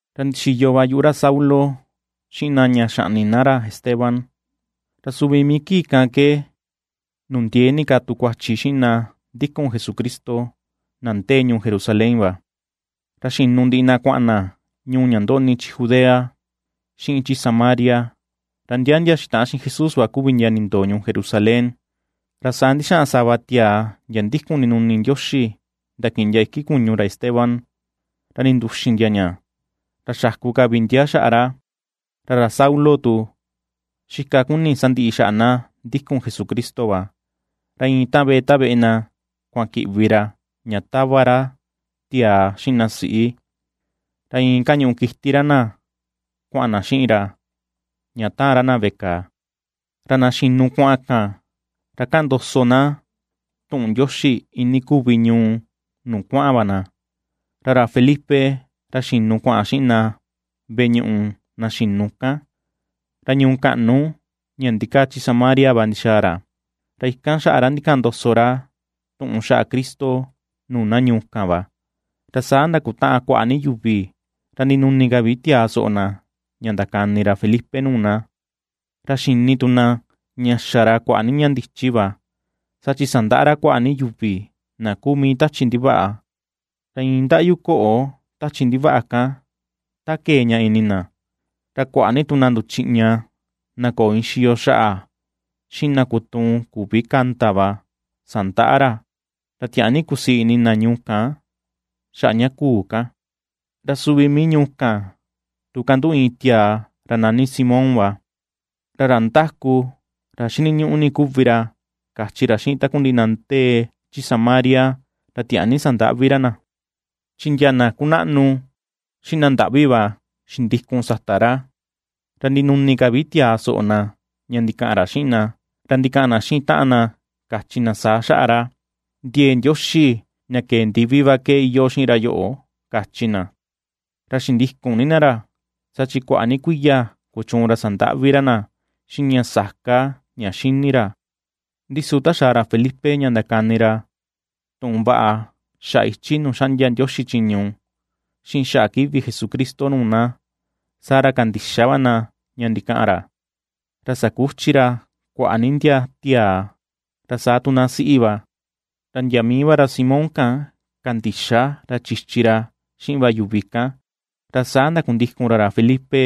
Ra ndixiyo va yuꞌu ra Saulo xiꞌin na ña xaꞌni na ra Esteban. Ra suvi mii kii kan ke nundiee ni ka tu kuachi xiꞌin na ndikun Jesucristo, na ndee ñuu Jerusalén va, ra xinu ndiꞌi na kuaꞌan na ñuu ña ndoꞌni chi Judea, xiꞌin chi Samaria, ra ndia ndia xitaꞌan xiꞌin Jesús va kuvi ndia nindoo ñuu Jerusalén. Ra saa ndixaꞌan sava tiaa ndia ndikun ndinuni Ndioxi ndakiꞌin ndia iki kuñu ra Esteban, ra ninduxin ndia ña, ra xaku ka vi ndia xaꞌa ra. Ra ra Saulo tu, xika ^kuni sandiꞌi xaꞌa na ndikun Jesucristo va; ra iin ta veꞌe ta veꞌe na kuaꞌan kiꞌvi ra ña tava ra tiaa xiꞌin na siꞌi, ra iin kañuꞌu kiti ra na kuaꞌan na xiꞌin ra ña taan ra na veꞌe kàà. Ra na xinu kuaꞌan kan, ra ^kaꞌan ndoso na tuꞌun Ndioxi iinii kuvi ñuu nuu kuaꞌan va na. Ra ra Felipe, ra xinu kua̱ꞌa̱n xiꞌin na veꞌe ñuꞌu na xinu kan, ra ñuu kaꞌnu ña ndikaa chi Samaria va ndixaa ra, ra ikan xaꞌa ra ndikaꞌan ndoso tuꞌun xaꞌa Cristo nuu na ñuu kan va. Ra saa ndakutaꞌan kuaꞌa ni yuvi, ra ndinuni ka vi tiaa soꞌo na ña ndakani ra Felipe nuu na, ra xini tu na ña xa ra kuaꞌa ni ña ndichi va. Saa chi sandaꞌa ra kuaꞌa ni yuvi na kuu mii tachi ndivaꞌa, ra iin ndaꞌyu koꞌo tachi ndivaꞌa kan ta kee ña ini na; ra kuaꞌa ni tu na nduchiꞌña na köo iin xiyo xaꞌa, xiꞌin na kutuun küvi kanda va, sandaꞌa ra. Ra tiaa ni kusii ini na ñuu kan xaꞌa ña kuu kan. Ra suvi mii ñuu kan tu kanduꞌu iin tiaa ra nani Simón va, ra ra ndáku, ra xiniñuꞌu ni kuvi ra kachi ra xiꞌin takundiꞌi na ndee chi Samaria, ra tiaa ni sandaꞌvi ra na. Chi ndia na kunaꞌnu xiꞌin na ndaꞌvi va xindikun sata ra, ra ndinuni ka vi tiaa soꞌo na ña ndikaꞌan ra xiꞌin na, ra ndikaꞌan na xiꞌin taꞌan na kachi na saa xaꞌa ra: ―Ndiee Ndioxi ña kee ndivi va ke iyoo xiꞌin ra yoꞌo ―kachi na. Ra xindikun ni na ra, saa chi kuaꞌa ni kuiya kuchuun ra sandaꞌvi ra na xiꞌin ña sa̱ká ña xini ra. Ndi su ta xaa ra Felipe, ña ndakani ra tuꞌun vaꞌa xaꞌa ichi nuu xaꞌndia Ndioxi chiñu xiꞌin xaꞌa kivi Jesucristo nuu na, saa ra kandixa va na ña ndikaꞌan ra, ra sakuchi ra kuaꞌa ni ndia tiaa, ra saa tu na siꞌi va. Ra ndia mii va ra Simón kan kandixa ra chichi ra xiꞌin va yuvi kan, ra saa ndakundikun ra ra Felipe,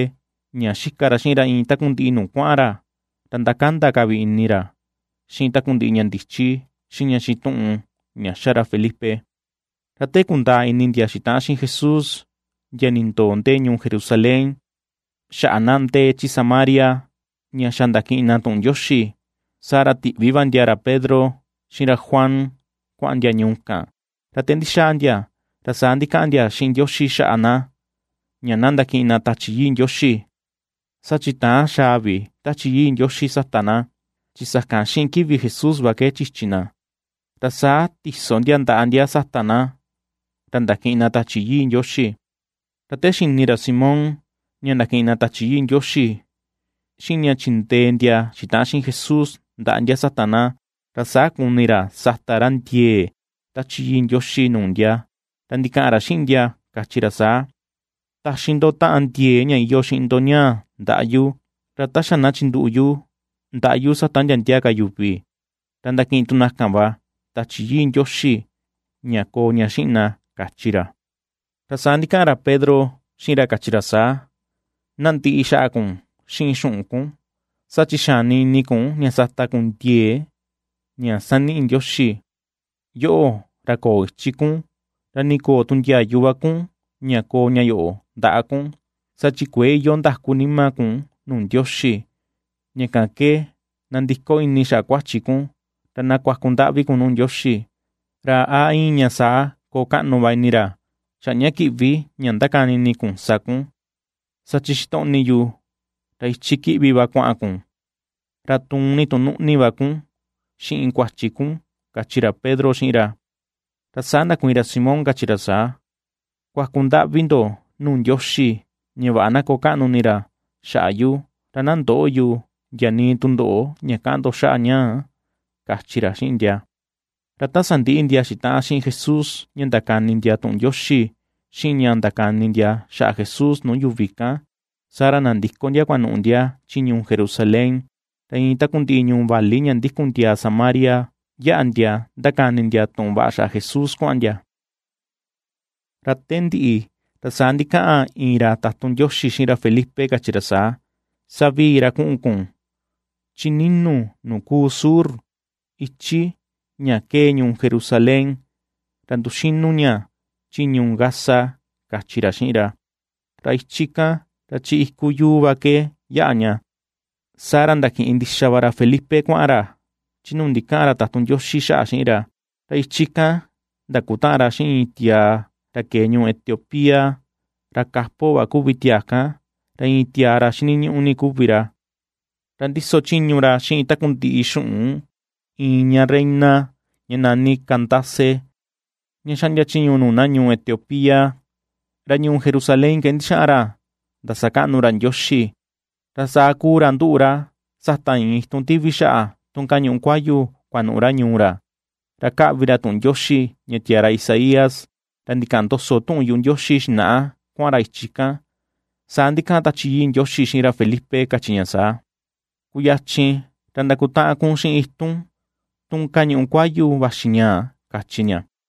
ña xika ra xiꞌin ra iin takundiꞌi nuu kuaꞌan ra, ra ^ndakanda ka vi ini ra xiꞌin takundiꞌi ña ndichi, xiꞌin ña xituꞌun ña xa ra Felipe. Ra te kundaa ini ndia xitaꞌan xiꞌin Jesús ndia nindoo ndee ñuu Jerusalén xaꞌa na ndee chi Samaria ña xa ndakiꞌin na tuꞌun Ndioxi, saa ra tiꞌvi va ndia ra Pedro xiꞌin ra Juan kuaꞌan ndia ñuu kan. Ra te ndixaa ndia, ra saa ndikaꞌan ndia xiꞌin Ndioxi xaꞌa na, ña na ndakiꞌin na Tachi Yii Ndioxi. Saa chi täan xa̱a̱ vi Tachi Yii Ndioxi sata na, chi sakan xiꞌin kivi Jesús va ke chichi na. Ra saa ti̱so ndia ndaꞌa ndia sata na, ra ndakiꞌin na Tachi Yii Ndioxi. Ra te xini ra Simón ña ndakiꞌin na Tachi Yii Ndioxi xiꞌin ña chindee ndia xitaꞌan xiꞌin Jesús ndaꞌa ndia sata na, ra saa kuni ra ña sata ra ndiee Tachi Yii Ndioxi nuu ndia, ra ndikaꞌan ra xiꞌin ndia, kachi ra saa: ―Taxi ndo taꞌan ndiee ña iyoo xiꞌin ndo ñaa ndaꞌa yu, ra ta xa na chinduꞌu yu ndaꞌa yu sata ndia ndia ka yuvi, ra ndakiꞌin tu na kan va Tachi Yii Ndioxi ña koo ña xiꞌin na ―kachi ra. Ra saa ndikaꞌan ra Pedro xiꞌin ra kachi ra saa: ―Na ndiꞌi xaꞌa kun xiꞌin xuꞌun kun, saa chi xani ini kun ña sata kun ndiee ña saniꞌi Ndioxi. Yoꞌo ra köo ichi kun, ra nii köo tu ndiayu va kun ña koo ña yoꞌo ndaꞌa kun, saa chi kuëe iyoo ndakú nima kun nuu Ndioxi. Ña kan ke na nandiko ini xaꞌa kuachi kun, ra na kuaku ndaꞌvi kun nuu Ndioxi, ra a iin ña saa koo kaꞌnu va ini ra xaꞌa ña kiꞌvi ña ndakani ini kun sa kun. Saa chi xitoꞌni yu ra ichi kiꞌvi va kuaꞌan kun, ra tuun ni tu nuꞌni va kun xiꞌin kuachi kun ―kachi ra Pedro xiꞌin ra. Ra saa ndakuiin ra Simón kachi ra saa: ―Kuaku ndaꞌvi ndo nuu Ndioxi ña vaꞌa na koo kaꞌnu ini ra xaꞌa yu, ra na ndöꞌo yu ndia nii tundoꞌo ña kaꞌan ndo xaꞌa ñaa ―kachi ra xiꞌin ndia. Ra ta sandiꞌi ndia xitaꞌan xiꞌin Jesús ña ndakani ndia tuꞌun Ndioxi xiꞌin ña ndakani ndia xaꞌa Jesús nuu yuvi kan, saa ra nandiko ndia kuanuꞌu ndia chi ñuu Jerusalén, ra iin takundiꞌi ñuu vali ña ndikun ndia Samaria yaꞌa ndia ndakani ndia tuꞌun vaꞌa xaꞌa Jesús kuaꞌan ndia. Ra te ndiꞌi, ra saa ndikaꞌan iin ra tatun Ndioxi xiꞌin ra Felipe kachi ra saa: ―Savii ra kuꞌun kun chi ni̱nu̱ nuu kuu sur, ichi ña kee ñuu Jerusalén ra nduxinu ña chi ñuu Gaza ―kachi ra xiꞌin ra. Ra ichi kan ra chi iku yuu va ke yaꞌa ña. Saa ra ndakiꞌin ndixa va ra Felipe kuaꞌan ra chi nuu ndikaꞌan ra tatun Ndioxi xaꞌa xiꞌin ra, ra ichi kan ndakutaꞌan ra xiꞌin iin tiaa ra kee ñuu Etiopía; ra kapo va kuvi tiaa kan, ra iin tiaa ra xiniñuꞌu ni kuvi ra, ra ndiso chiñu ra xiꞌin takundiꞌi xuꞌun iin ña reina ña nani Candace, ña xaꞌndia chiñu nuu na ñuu Etiopía, ra ñuu Jerusalén ke ndixaꞌan ra ndasakaꞌnu ra Ndioxi. Ra saa kuu ra nduꞌu ra sata iin itun tivi xaꞌa tun kañuꞌu kuayu kuanuꞌu ra ñuu ra, ra kaꞌvi ra tuꞌun Ndioxi ña tiaa ra Isaías ra ndikaꞌan ndoso tuꞌun yuꞌu Ndioxi xinaꞌa kuaꞌan ra ichi kan. Saa ndikaꞌan Tachi Yii Ndioxi xiꞌin ra Felipe kachi ña saa: ―Kuyachin ra ndakutaꞌan kun xiꞌin itun tun kañuꞌu kuayu vaxi ñaꞌa ―kachi ña.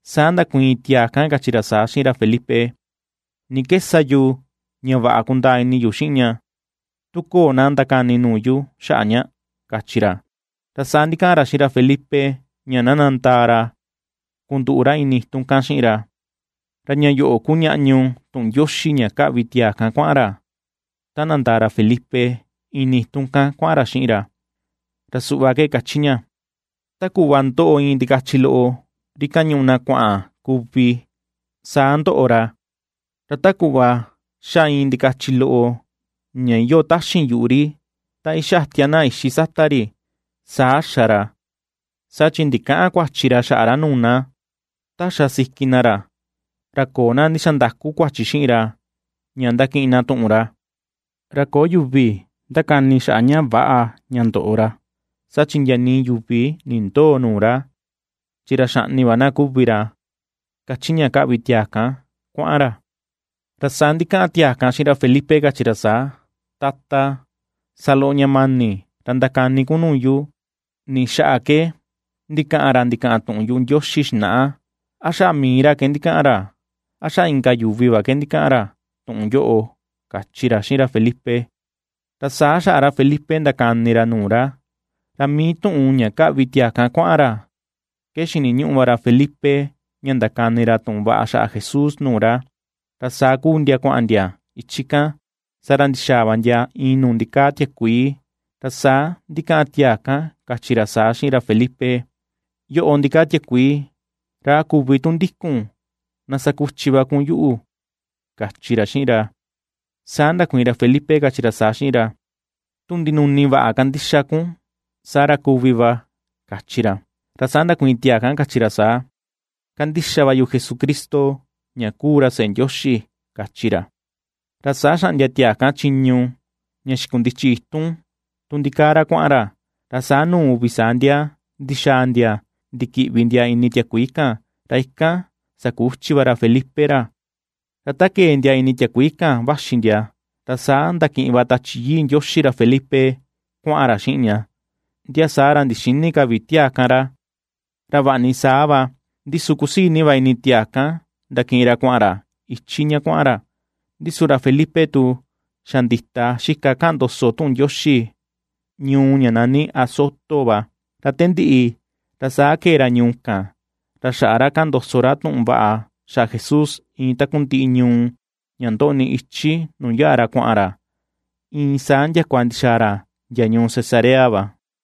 Saa ndakuiin tiaa kan kachi ra saa xiꞌin ra Felipe: ―¿Ni ke sa yu ña vaꞌa kundaa ini yu xiꞌin ña, tu köo na ndakani nuu yu xaꞌa ña? ―kachi ra. Ra saa ndikaꞌan ra xiꞌin ra Felipe ña na nandaa ra kunduꞌu ra ini itun kan xiꞌin ra. Ra ña yoꞌo kuu ñaꞌñu tuꞌun Ndioxi ña kaꞌvi tiaa kan kuaꞌan ra, ta nandaa ra Felipe ini itun kan kuaꞌan ra xiꞌin ra; ra suꞌva ke kachi ña: Ta kuꞌva ^ndoꞌo iin ndikachi loꞌo ri kañuꞌu na kuaꞌan kuvi, saa ndoꞌo ra; Ra ta kuꞌva ^xa iin ndikachi loꞌo ña iyoo taxin yuꞌu ri, ta ixatia na ixi sata ri, saa xa ra, saa chi ndikäꞌan kuachi ra xaꞌa ra nuu na. Ta xa siki na ra, ra köo na ndixandaku kuachi xiꞌin ra ña ndakiꞌin na tuꞌun ra. Ra köo yuvi ndakani xaꞌa ña väꞌa ña ndoꞌo ra, saa chi ndia nii yuvi nindöo nuu ra. chi ra xaꞌni va na kuvi ra, kachi ña kaꞌvi tiaa kan kuaꞌan ra. Ra saa ndikaꞌan tiaa kan xiꞌin ra Felipe kachi ra saa: ―Tata, sa loꞌo ña mani ra ndakani kun nuu yu. ¿Ni xaꞌa ke ndikaꞌan ra ndikaꞌan tuꞌun yuꞌu Ndioxi xinaꞌa? ¿A xaꞌa mii ra ke ndikaꞌan ra? ¿A xaꞌa inka yuvi va ke ndikaꞌan ra tuꞌun yoꞌo? ―kachi ra xiꞌin ra Felipe. Ra saa xaꞌa ra Felipe ndakani ra nuu ra, ra mii tuꞌun ña kaꞌvi tiaa kan kuaꞌan ra ke xiniñuꞌu va ra Felipe ña ndakani ra tuꞌun vaꞌa xaꞌa Jesús nuu ra. Ra saa kuu ndia kuaꞌan ndia ichi kan, saa ra ndixaa va ndia iin nuu ndikaa tiakuii, ra saa ndikaꞌan tiaa kan kachi ra saa xiꞌin ra Felipe: ―Yoꞌo ndikaa tiakuii, ra a küvi tu ndikun na sakuchi va kun yuꞌu ―kachi ra xiꞌin ra. Saa ndakuiin ra Felipe kachi ra saa xiꞌin ra: ―Tu ndinuni vaꞌa kandixa kun saa ra kuvi va ―kachi ra. Ra saa ndakuiin tiaa kan kachi ra saa: ―Kandixa va yu Jesucristo ña kuu ra seꞌe Ndioxi ―kachi ra. Ra saa xaꞌndia tiaa kan chiñu ña xikundichi itun tun ndikaa ra kuaꞌan ra, ra saa nuu uvi saa ndia ndixaa ndia ndikiꞌvi ndia ini tiakuii kan, ra ikan sakuchi va ra Felipe ra. Ra ta kee ndia ini tiakuii kan vaxi ndia, ra saa ndakiꞌin va Tachi Yii Ndioxi ra Felipe kuaꞌan ra xiꞌin ña, ndia saa ra ndixïni ka vi tiaa kan ra. Ra vaꞌa ni saa va, ndi su kusii ni va ini tiaa kan ndakiꞌin ra kuaꞌan ra ichi ña kuaꞌan ra. Ndi su ra Felipe tu, xa ndita xika kaꞌan ndoso tuꞌun Ndioxi ñuu ña nani Azoto va, ra te ndiꞌi, ra saa kee ra ñuu kan ra xaꞌa ra kaꞌan ndoso ra tuꞌun vaꞌa xaꞌa Jesús iin takundiꞌi ñuu ña ndoꞌni ichi nuu yaꞌa ra kuaꞌan ra iin saa ndiakua ndixaa ra ndia ñuu Cesarea va.